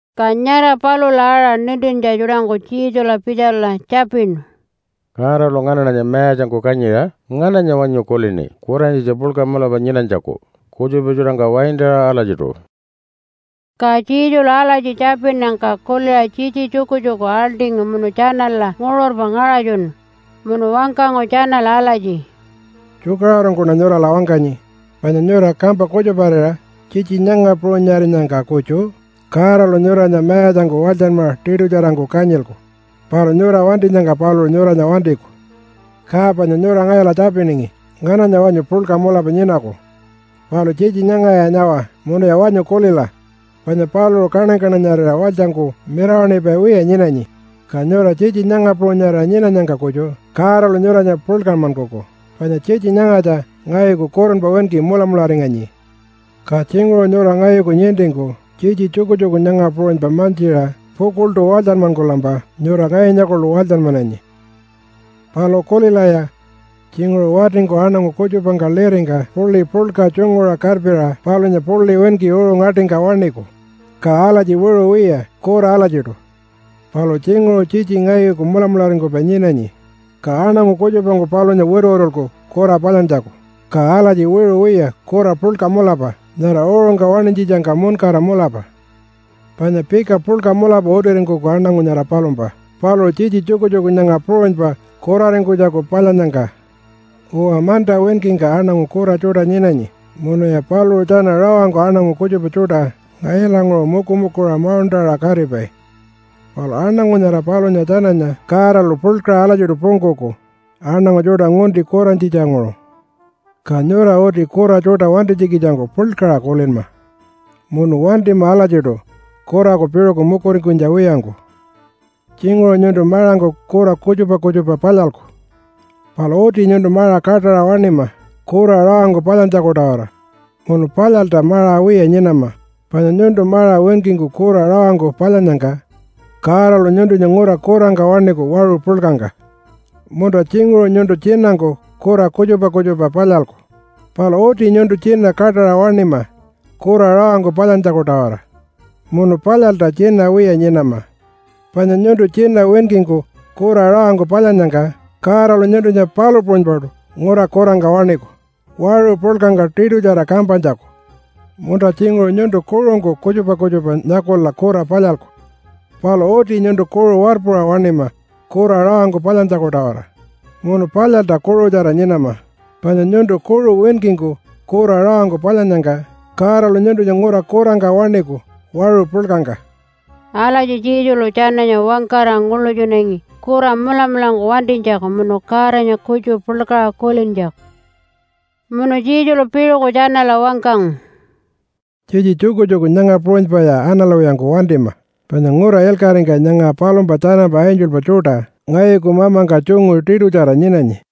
Ka nyara palula aṟa nintintja tjuṯangku Jesula pitjala tjapinu, “Godalu nganaṉanya mayatjangku kanyiṟa ngananya wanyu kulini kuranyitja puḻka mulapa nyinanytjaku kutjupa tjuṯangka waintaṟa alatjiṯu?” Ka Jesulu alatji tjapinnyangka kuliṟa tjitji tjukutjuku aḻṯingu munu tjanala nguṟurpa ngaṟatjunu. Munu wangkangu tjanala alatji, “Tjukaṟurungkuṉa nyurala wangkanyi, panya nyura kampa kutjuparira tjitji nyanga puṟunyarinyangka kutju Godalu nyuranya mayatjangku walytjanmaṟa tiṯutjarangku kanyilku. Palu nyura wantinyangka paluṟu nyuranya wantiku. Ka panya nyura ngayula tjapiningi ngananya wanyu puḻka mulapa nyinaku. Palu tjitji nyangaya nyawa munuya wanyu kulila, panya paluṟu kaṉany-kaṉanyarira walytjangku mirawaṉipai wiya nyinanyi, ka nyura tjitji nyanga puṟunyarira nyinanyangka kutju Godalu nyuranya puḻkanmankuku. Panya tjitji nyangatja ngayuku kurunpa winki mulamularinganyi. Ka tjinguṟu nyura ngayuku nintingku tjitji tjukutjuku nyanga puṟunypa mantjiṟa pukuḻṯu walytjanmankulampa nyura ngayunya kuḻu walytjanmananyi. “Palu kulilaya! Tjinguṟu watingku aṉangu kutjupangka liringka puḻi puḻka tjunguṟa karpiṟa palunya puḻi winki uṟu ngaṯingka waṉiku, ka alatji wiṟu wiya, kura alatjiṯu. Palu tjinguṟu tjitji ngayuku mulamularingkupai nyinanyi, ka aṉangu kutjupangku palunya wituwitulku kura palyantjaku, ka alatji wiṟu wiya kura puḻka mulapa nyara uṟungka waṉinytjitjangka muṉkara mulapa. Panya pika puḻka mulapa utiringkuku aṉangu nyara palumpa paluṟu tjitji tjukutjuku nyanga puṟunypa kuraringkunytjaku palyannyangka. Uwa, manta winkingka aṉangu kura tjuṯa nyinanyi munuya paluṟu tjana rawangku aṉangu kutjupa tjuṯa ngayulanguṟu mukumukuṟa mauṉṯaṟa katipai. Palu aṉangu nyara palunya tjananya Godalu puḻkaṟa alatjiṯu pungkuku aṉangu tjuṯa ngunti kurantjitjanguṟu. Ka nyura uti kura tjuṯa wantinytjikitjangku puḻkaṟa kulinma munu wantima alatjiṯu kuraku piṟuku mukuringkunytja wiyangku. Tjinguṟu nyuntu maṟangku kura kutjupa kutjupa palyalku. Palu uti nyuntu maṟa kaṯaṟa waṉima kura rawangku palyantjaku-tawara, munu palyalta maṟa wiya nyinama, panya nyuntu maṟa winkingku kura rawangku palyannyangka Godalu nyuntunya ngura kurangka waṉiku waṟu puḻkangka. Munta tjinguṟu nyuntu tjinangku kura kutjupa kutjupa palyalku. Palu uti nyuntu tjina kaṯaṟa waṉima kura rawangku palyantjaku-tawara, munu palyalta tjina wiya nyinama, panya nyuntu tjina winkingku kura rawangku palyannyangka Godalu nyuntunya palu puṟunypaṯu ngura kurangka waṉiku waṟu puḻkangka tiṯutjara kampanytjaku. Munta tjinguṟu nyuntu kuṟungku kutjupa kutjupa nyakula kura palyalku. Palu uti nyuntu kuṟu warpuṟa waṉima kura rawangku palyantjaku-tawara munu palyalta kuṟutjara nyinama, panya nyuntu kuṟu winkingku kura rawangku palyannyangka Godalu nyuntunya ngura kurangka waṉiku waṟu puḻkangka.” Alatji Jesulu tjananya wangkara nguḻutjunangi kura mulamulangku wantinytjaku munu Godanya kutju puḻkaṟa kulintjaku. Munu Jesulu piṟuku tjanala wangkangu, “Tjitji tjukutjuku nyanga puṟunypaya analwiyangku wantima, panya ngura ilkaṟingka nyanga palumpa tjanampa angelpa tjuṯa ngayuku mamangka tjungu tiṯutjara nyinanyi.”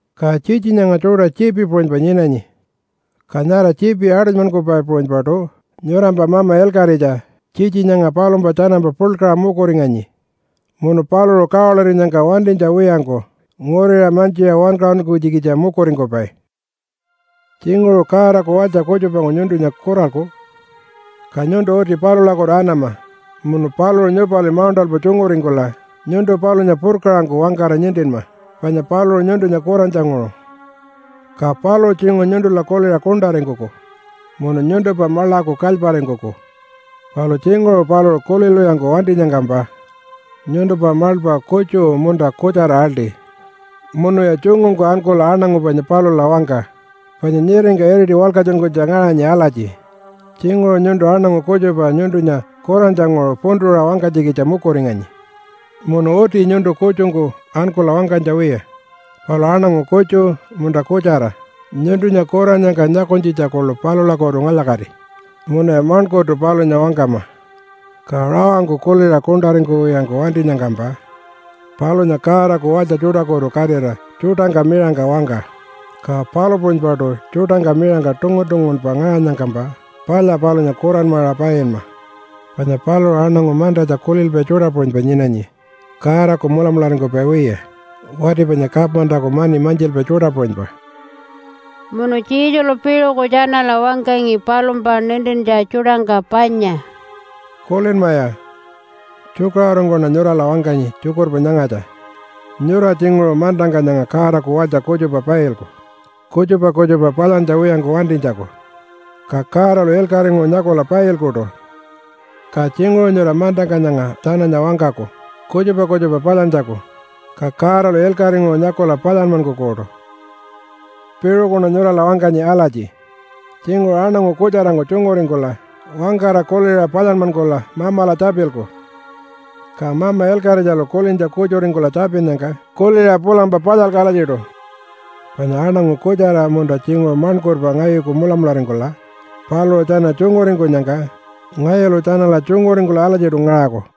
Ka tjitji nyanga tjuṯa tjiipi puṟunypa nyinanyi, ka nyara tjiipi aṯunymankupai puṟunypaṯu nyurampa mama ilkaṟitja tjitji nyanga palumpa tjanampa puḻkaṟa mukuringanyi, munu paluṟu kawalirinyangka wantinytja wiyangku nguriṟa mantjiṟa wankaṟunkunytjikitja mukuringkupai. “Tjinguṟu Godaku walytja kutjupangku nyuntunya kuralku. Ka nyuntu uti palulakutu anama munu paluṟu nyupali mauṉṯalpa tjunguringkula nyuntu palunya purkaṟangku wangkara nintinma panya paluṟu nyuntunya kurantjanguṟu. Ka paluṟu tjinguṟu nyuntula kuliṟa kuṉṯaringkuku munu nyuntumpa maḻaku kalyparingkuku. Palu tjinguṟu paluṟu kulilwiyangku wantinyangkampa nyuntumpa maḻpa kutju munta kutjara aḻṯi munuya tjungungku ankula aṉangu panya palula wangka. Panya nyiringka iriti walkatjunkunytja ngaṟanyi alatji, ‘Tjinguṟu nyuntu aṉangu kutjupa nyuntunya kurantjanguṟu puntuṟa wangkanytjikitja mukuringanyi. Munu uti nyuntu kutjungku ankula wangkanytja wiya, palu aṉangu kutju, munta kutjara nyuntunya kurannyangka nyakunytjitja kuḻu palulakutu ngalya-kati munuya maṉkurtu palunya wangkama.’ Ka rawangku kuliṟa kuṉṯaringkuwiyangku wantinyangkampa palunya Godaku walytja tjuṯakutu katira tjuṯangka miṟangka wangka. Ka palu puṟunypaṯu tjuṯangka miṟangka tungun-tungunpa ngaṟanyangkampa palya palunya kuranmaṟa painma. Panya paluṟu aṉangu mantatja kulilpai tjuṯa puṟunypa nyinanyi Godaku mulamularingkupai wiya, wati panya kamantaku mani mantjilpai tjuṯa puṟunypa.” Munu Jesulu piṟuku tjanala wangkangi palumpa nintintja tjuṯangka panya, “Kulinmaya! Tjukaṟurungkuṉa nyurala wangkanyi tjukurpa nyangatja. Nyura tjinguṟu mantangka nyanga Godaku walytja kutjupa pailku kutjupa kutjupa palyantja wiyangku wantinytjaku, ka Godalu ilkaṟinguṟu nyakula pailkuṯu. Ka tjinguṟu nyura mantangka nyanga tjananya wangkaku kutjupa kutjupa palyantjaku, ka Godalu ilkaṟinguṟu nyakula palyanmankukuṯu. “Piṟukuṉa nyurala wangkanyi alatji, tjinguṟu aṉangu kutjarangku tjunguringkula wangkara kuliṟa palyanmankula Mamala tjapilku, ka Mama Ilkaṟitjalu kulintja kutjuringkula tjapinnyangka kuliṟa pulampa palyalku alatjiṯu. Panya aṉangu kutjara munta tjinguṟu maṉkurpa ngayuku mulamularingkula paluṟu tjana tjunguringkunyangka ngayulu tjanala tjunguringkula alatjiṯu ngaṟaku.”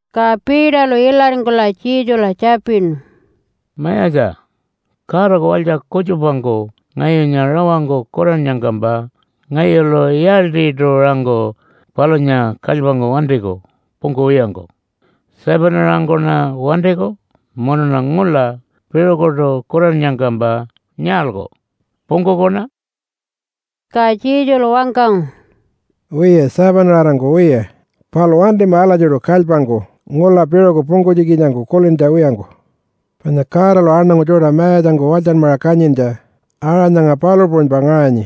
Ka Peterlu ilaringkula Jesula tjapinu, “Mayatja, Godaku walytja kutjupangku ngayunya rawangku kurannyangkampa ngayulu yaaltjiṯu-aṟangku palunya kalypangku wantiku pungkuwiyangku? 7-aṟangkuṉa wantiku munuṉa ngula piṟukuṯu kurannyangkampa nyaalku? Pungkukuṉa?” Ka Jesulu wangkangu, “Wiya, 7-aṟangku wiya. Palu wantima alatjiṯu kalypangku ngula piṟuku pungkunytjikitjangku kulintja wiyangku. Panya Godalu aṉangu tjuṯa mayatjangku walytjanmaṟa kanyintja aṟa nyanga palu puṟunypa ngaṟanyi.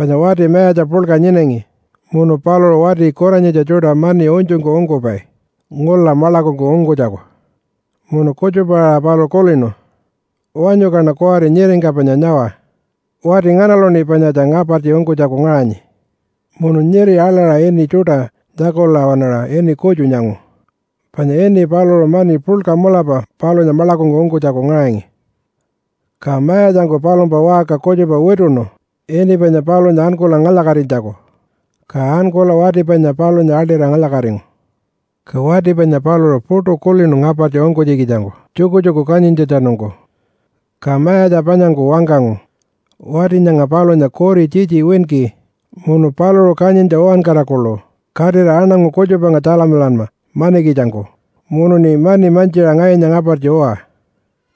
Panya wati mayatja puḻka nyinangi munu paluṟu wati kuranyitja tjuṯa mani unytjungku ungkupai ngula maḻakungku ungkunytjaku. Munu kutjupa-aṟa paluṟu kulinu, ‘Wanyu kaṉa kuwari nyiringka panya nyawa wati nganaluṉi panyatja ngapartji ungkunytjaku ngaṟanyi.’ Munu nyiri aḻaṟa ini tjuṯa nyakula waṉaṟa ini kutju nyangu, panya ini paluṟu mani puḻka mulapa palunya maḻakungku ungkunytjaku ngaṟangi. Ka mayatjangku palumpa waṟka kutjupa wituṉu ini panya palunya ankula ngalya-katinytjaku. Ka ankula wati panya palunya aḻṯira ngalya-katingu. Ka wati panya paluṟu puṯu kulinu ngapartji ungkunytjikitjangku tjukutjuku kanyintjatjanungku. Ka mayatja panyangku wangkangu, ‘Wati nyanga palunya kuri tjitji winki munu paluṟu kanyintja uwankara kuḻu katira aṉangu kutjupangka tjalamilanma manikitjangku munuṉi mani mantjiṟa ngayunya ngapartji uwa.’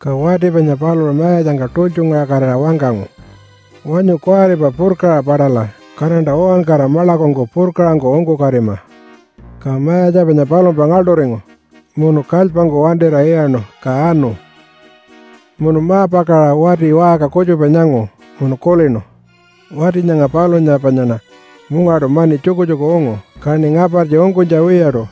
Ka wati panya paluṟu mayatjangka tultjungaṟakatira wangkangu, ‘Wanyu kuwaripa purkaṟa paṯala, kaṉanta uwankara maḻakungku purkaṟangku ungkukatima!’ Ka mayatja panya palumpa ngaḻṯuringu, munu kalypangku wantira iyaṉu ka anu. “Munu ma-pakaṟa wati waṟka kutjupa nyangu munu kulinu, ‘Wati nyanga palunya panyaṉa mungaṯu mani tjukutjuku ungu, kaṉi ngapartji ungkunytja wiyaṯu.’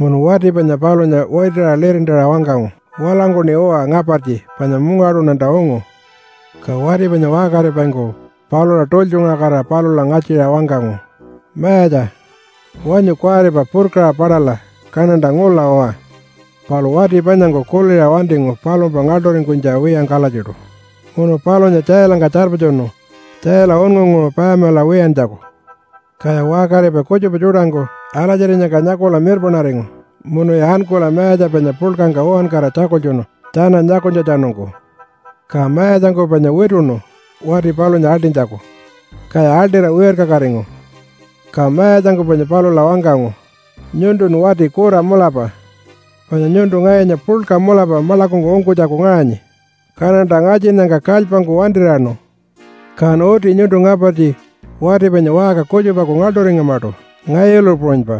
Munu wati panya palunya witiṟa lirintaṟa wangkangu, ‘Walangkuṉi uwa ngapartji panya mungaṯuṉanta ungu!’ Ka wati panya waṟkaripaingku palula tultjungaṟakatira palula ngatjiṟa wangkangu, ‘Mayatja! Wanyu kuwaripa purkaṟa paṯala, kaṉanta ngula uwa!’ Palu wati panyangku kuliṟa wantingu palumpa ngaḻṯuringkunytja wiyangku alatjiṯu, munu palunya tjailangka tjarpatjunu tjaila unngunguṟu payamilaṟa wiyantjaku. Kaya waṟkaripai kutjupa tjuṯangku alatjirinyangka nyakula mirpaṉaringu munuya ankula mayatja panya puḻkangka uwankara tjakultjunu tjana nyakunytjatjanungku. Ka mayatjangku panya wituṉu wati palunya aḻṯinytjaku, kaya aḻṯira wirkakatingu. Ka mayatjangku panya palula wangkangu, ‘Nyuntun wati kura mulapa! Panya nyuntu ngayunya puḻka mulapa maḻakungku ungkunytjaku ngaṟanyi, kaṉanta ngatjinnyangka kalypangku wantir'iyaṉu. Kan uti nyuntu ngapartji wati panya waṟka kutjupaku ngaḻṯuringamaṯu ngayulu puṟunypa.’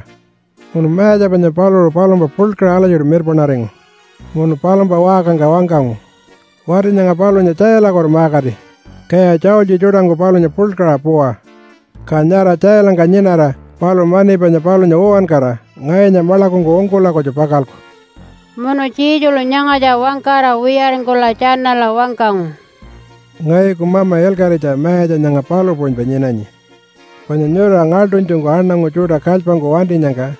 Munu mayatja panya paluṟu palumpa puḻkaṟa alatjiṯu mirpaṉaringu munu palumpa waṟkangka wangkangu, ‘Wati nyanga palunya tjailakutu ma-kati, kaya tjaultji tjuṯangku palunya puḻkaṟa puwa. Ka nyara tjailangka nyinara paluṟu mani panya palunya uwankara ngayunya maḻakungku ungkula kutju pakalku.’” Munu Jesulu nyangatja wangkara wiyaringkula tjanala wangkangu, “Ngayuku mama ilkaṟitja mayatja nyanga palu puṟunypa nyinanyi. Panya nyura ngaḻṯunytjungku aṉangu tjuṯa kalypangku wantinyangka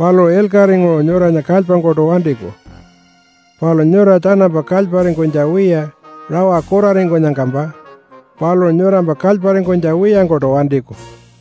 paluṟu ilkaṟinguṟu nyuranya kalypangkuṯu wantiku, palu nyura tjanampa kalyparingkunytja wiya rawa kuraringkunyangkampa paluṟu nyurampa kalyparingkunytja wiyangkuṯu wantiku.”